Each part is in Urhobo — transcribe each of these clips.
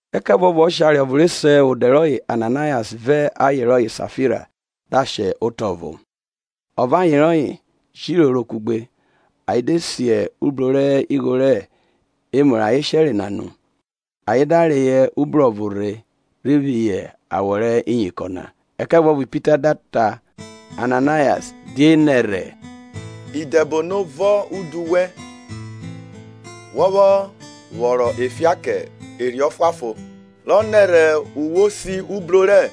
Ẹkẹvuọvo ọshare ọvo re se odẹ rọye Ananayas vẹ aye rọye Safira da shẹ otọ ovọ, ọ vẹ aye rọye jẹ iroro kugbe ayen de si ubro rẹ igho rẹ emu rẹ ayen shere na nu, ayen da reyọ ubro ọvo rhe rhi phihọ awọ rẹ iyinkọn na. Ẹkẹvuọvo Pita da ta Ananayas die nẹrhẹ idẹbono vọn udu wẹn wọ vwọ vwọron ofian kẹ Erhi Ọfuanfon rọ nẹrhẹ owẹ si ubro rẹ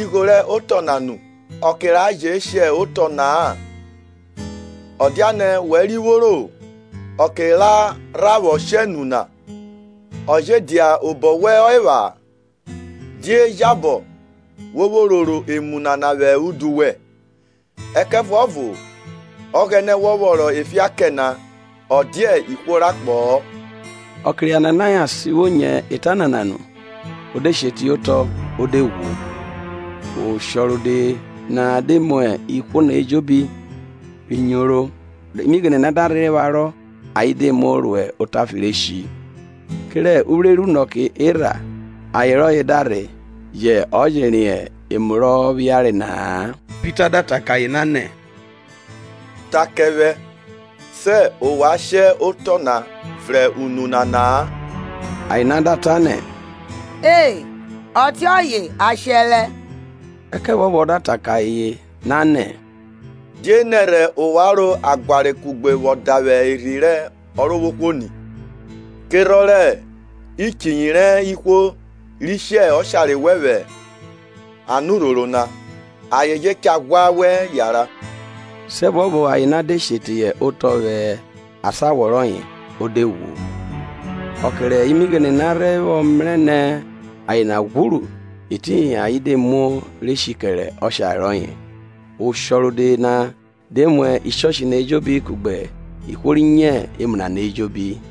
igho rẹ otọ na nu? Ọke ra je shẹ otọ na-a, ọ dianẹ wẹ ri vworo? Ọke ra rha vwọ shẹ nu na, ọ je dia obọ wẹn ọ epha? Die jabọ wo vwo roro emu nana vwẹ udu wẹn? Ẹkẹvuọvo Ọghẹnẹ wọ vwọron ofian kẹ na ọ dia ihwo rẹ akpọ-ọ. Ọke rẹ Ananayas vwo nyo eta nana nu, o de she teye otọ o de ghwu. Oshọ rode na de mu ihwo na ejobi ri nyoro. Imighene na da rhe pharọ ayen de muo ro otafe re shi. Kerẹ uvwre rẹ unọke erha aye rọye da rhe, yẹ ọ je riẹn emu rọ phiare na-a. Pita da ta kẹ aye na nẹ, Ta kẹ vwẹ sẹ ovwan shẹ otọ na vrẹn unu nana-a. Aye na da ta nẹ, E, ọtiọye a shẹrẹ. Ẹkẹvuọvo ọ da ta kẹ aye na nẹ. Die nẹrhẹ ovwan ro ẹguare kugbe vwọ davwe Erhi rẹ Ọrovwohwo ni? Kerhọn rẹ ichiyi rẹ ihwo ri shi ọshare wẹn vwẹ anurhoro na, ayen je cha ghwa wẹ yanran. Siẹvuọvo aye na de she teye otọ vwẹ asan awọ rọye o de ghwu. Ọke rẹ imighene na rhe vwọ mrẹ nẹ aye na ghwuru, etiyin ayen de muo re shi kẹrẹ ọshare rọye. Oshọ rode na de mu ishọshi na ejobi kugbe ihwo ri nyo emu nana ejobi.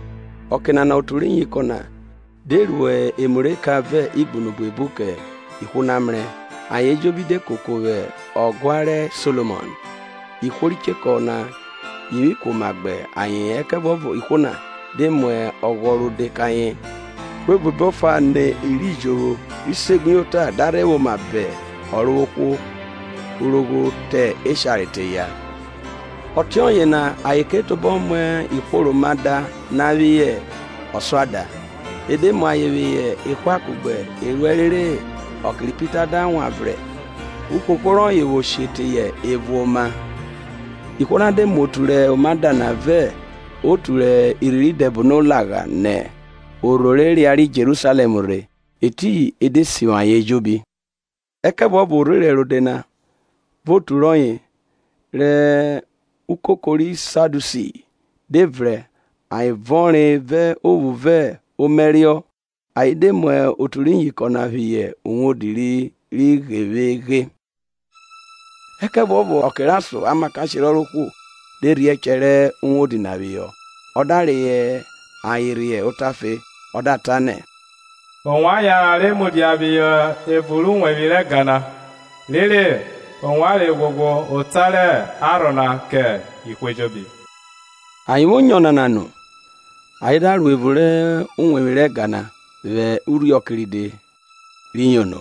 Ọke nana otu rẹ iyinkọn na de ru emu rẹ eka vẹ igbunu buebu kẹ ihwo na mrẹ. Ayen ejobi de koko vwẹ Ọguan ri Solomọn. Ihwo ri chekọ na yivwi kuoma gbe ayeen, ẹkẹvuọvo ihwo na de mu ọghọ rode kẹ ayen. Ihwo buebu efa nọ i ri jovwo ri segbuyota na da rhe vwẹ oma ba Ọrovwohwo, urogho rẹ eshare te eya, ọtiọye na ayen ke tobọ mu ihwo rẹ oma da na phihọ ọsuada, e de mu ayen phihọ ehwa kugbe eruẹ rere ọke rẹ Pita da wan vrẹn uhoho rọye vwo she teyọ evo oma. Ihwo na de mu otu rẹ oma da na vẹ otu rẹ irhi rẹ idẹbono lagha nẹ orho re riariẹ Jerusalẹm rhe, etiyin e de sivwi ayen ejobi. Ẹkẹvuọvo orherẹn rode na vẹ otu rọye, rẹ ukoko rẹ Sadiusi, de vrẹn, ayen vọnre vẹ ophu vẹ omaẹriọ. Ayen de mu otu rẹ iyinkọn na phihọ vwodi ghevweghe. Ẹkẹvuọvo ọke rẹ ason amakashe rẹ Ọrovwohwo de rhie ẹchẹ rẹ uwodi na phihọ ọ da reyọ ayen rhe otafe ọ da ta nẹ, Ovwan yanran re mudia phihọ evun rẹ uwevwi rẹ ẹga na rere ovwan re ghwoghwo ota rẹ Arhọ na kẹ ihwo ejobi. Ayen vwo nyo ọnana nu, ayen da ro evun rẹ uwevwi rẹ ẹga na vwẹ urhiọke ride re yono.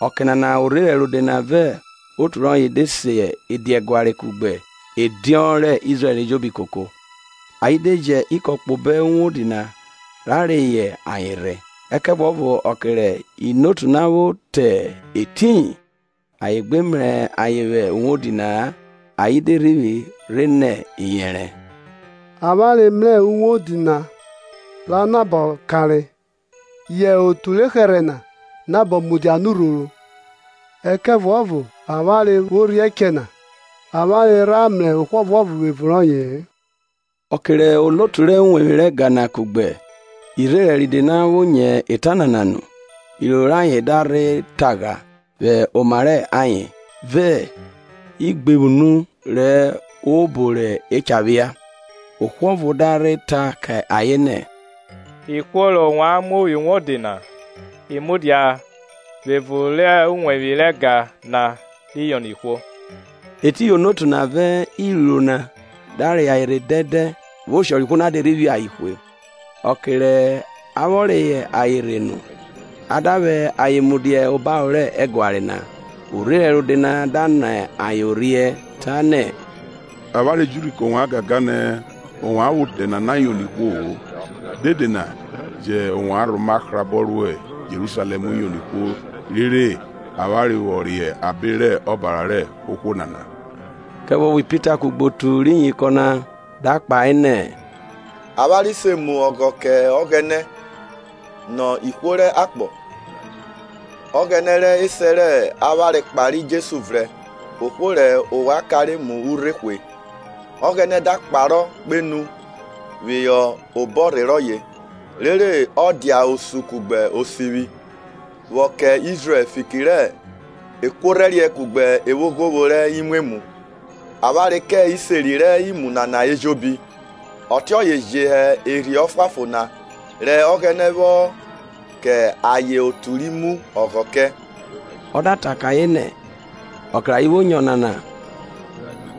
Ọke nana orherẹn rode na vẹ otu rọye de se ediaguare kugbe Ediọn rẹ Izrẹl ejobi koko, ayen de ji ikọn kpo obo uwodi na ra reyọ ayan rhe. Ẹkẹvuọvo ọke rẹ inotu na vwo te etiyin, ayen gbe mrẹ ayen vwẹ uwodi na-a, ayen de rhivwi rhe rhe nẹ iyẹnrẹ. Avwanre mrẹ uwodi na ra nabọ kanre yẹ otu rẹ ohẹrhẹ na nabọ mudia anurhoro, ẹkẹvuọvo avwanre vwo rhiẹ echẹ na avwanre rha mrẹ ohwo ọvuọvo vwẹ evun rọye-e. Ọke rẹ onotu rẹ uwevwi rẹ ẹga na kugbe irherẹn ride na vwo nyo eta nana nu, iroro rẹ ayen da rhe tagha vwẹ oma rẹ ayen, vẹ igbevwunu rẹ obo re cha phia. Ohwo ọvo da rhe ta ke ayen nẹ, Ihwo rẹ ovwan mu phihọ uwodi na i mudia vwẹ evun rẹ uwevwi rẹ ẹga na ri yono ihwo. Etiyin onotu na vẹ iruiruo na da ra reyọ ayen rhe dẹndẹn, vẹ oshọ rẹ ihwo na de rhe phi ayen hwe. Ọke rẹ a vwọ reyọ ayen rhe nu, a da vwẹ ayen mudia obaro rẹ ẹguare na. Orherẹn rode na da nọ ayen orhiẹ, tanẹ, Avwanre ji urhi kẹ ovwan gangan nẹ ovwan vwẹ odẹ nana yono ihwo-o, dede na yẹ ovwan rhoma hrabọ ro Jerusalẹm yono ihwo rere avwanre vwọ re abe rẹ ọbara rẹ ohwo nana. Ẹkẹvuọvo Pita kugbe otu rẹ iyinkọn na da kpahe nẹ, Avwanre se mu ọghọ kẹ Ọghẹnẹ nọ ihwo rẹ akpọ. Ọghẹnẹ rẹ esẹ rẹ avwanre kpare Jesu vrẹn ohwo rẹ ovwan kanre mu urhe hwe. Ọghẹnẹ da kparo kpenu phihọ obọrhe rọye rere ọ dia Osun kugbe Osivwi, vwọ kẹ Izrẹl fiki rẹ ekuorhẹriẹ kugbe evwoghovwo rẹ imwemwu. Avwanre kẹ iseri rẹ emu nana ejobi, ọtiọye je hẹ Erhi Ọfuanfon na rẹ Ọghẹnẹ vwọ kẹ ayen otu ri mu ọghọ kẹ. Ọke rẹ ayen vwo nyo ọnana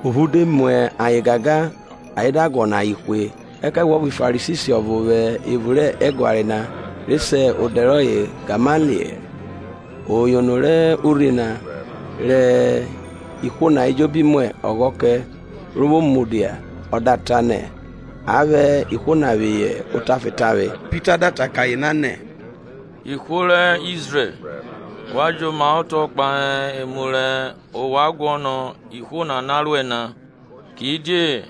ophu de mu ayen gangan ayen da guọnọ ayen hwe. Ẹkẹvuọvo Farisi ọvo vwẹ evun rẹ ẹguare na re se odẹ rọye Gamaliẹl, o yono rẹ urhi na, rẹ ihwo na ejobi mu ọghọ kẹ, ro vwo mudia ọ da ta nẹ a vwẹ ihwo na phihọ otafe tavwe. Ọ da ta kẹ ayen nẹ, Ihwo rẹ Izrẹl, wa jomaotọ kpahe emu rẹ ovwan guọnọ ihwo nana ruẹ na. Kidie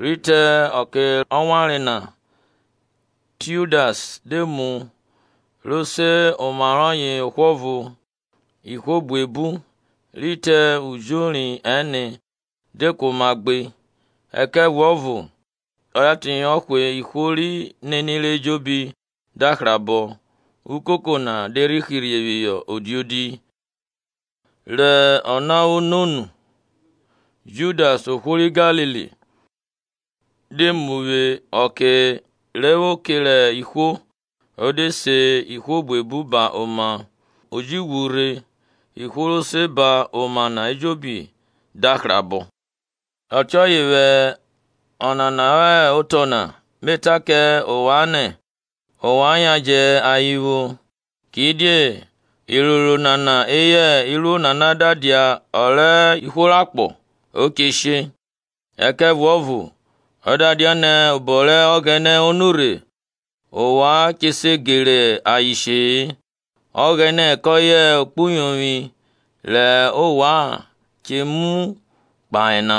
rhi te ọke rọ wanre na, Tiudas de mu, ro se oma rọye ohwo ọvo, ihwo buebu, ri te ujori ẹne, de kuoma gbe; ẹkẹvuọvo a da teyọ hwe ihwo ri nenire ejobi da hrabọ ukoko na de rhi hirhe phihọ odiodi. Rẹ ona vwọ no nu Judas ohwo ri Galili de mu vwẹ ọke re vwo kere ihwo o de se ihwo buebu ba oma; o ji ghwu rhe, ihwo ro se ba oma na ejobi da hrabọ. Ọtiọye vwẹ ọnana rọ hẹ otọ na me ta kẹ ovwan nẹ, ovwan yan jẹ ayen vwo; kidie iroro nana eyẹ iruo nana da dia ọ rẹ ihwo rẹ akpọ, o che she. Ẹkẹvuọvo ọ da dianẹ obọ rẹ Ọghẹnẹ o nurhe, ovwan che se gere ayen she-e. Ọghẹnẹ kọye ekpuyovwi rẹ ovwan che muẹ kpaha na.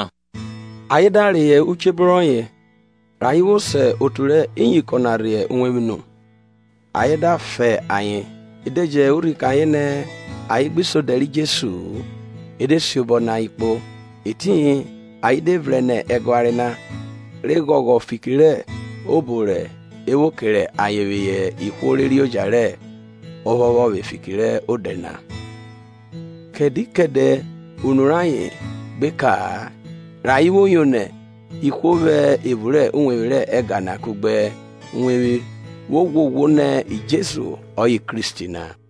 Ayen da reyọ uchebro rọye, rẹ ayen vwo se otu rẹ iyinkọn na rhe uwevwi nu, ayen da fa ayen e de ji urhi kẹ ayen nẹ ayen gbi se odẹ ri Jesu-u, e de siobọ nẹ ayen kpo. Etiyin ayen de vrẹn nẹ ẹguare na, re ghọghọ fiki robo re vwo kere ayen phihọ ihwo re reoja rẹ ophọphọvwe fiki rẹ Odẹ na. Kẹdẹ kẹdẹ unu rayen gbe ka-a rẹ ayen vwo yono ihwo vwẹ evun rẹ uwevwi rẹ ega na kugbe nẹ uwevwi kpo uwevwi vwo ghwoghwo nẹ Jesu ọye hẹ Kristi na.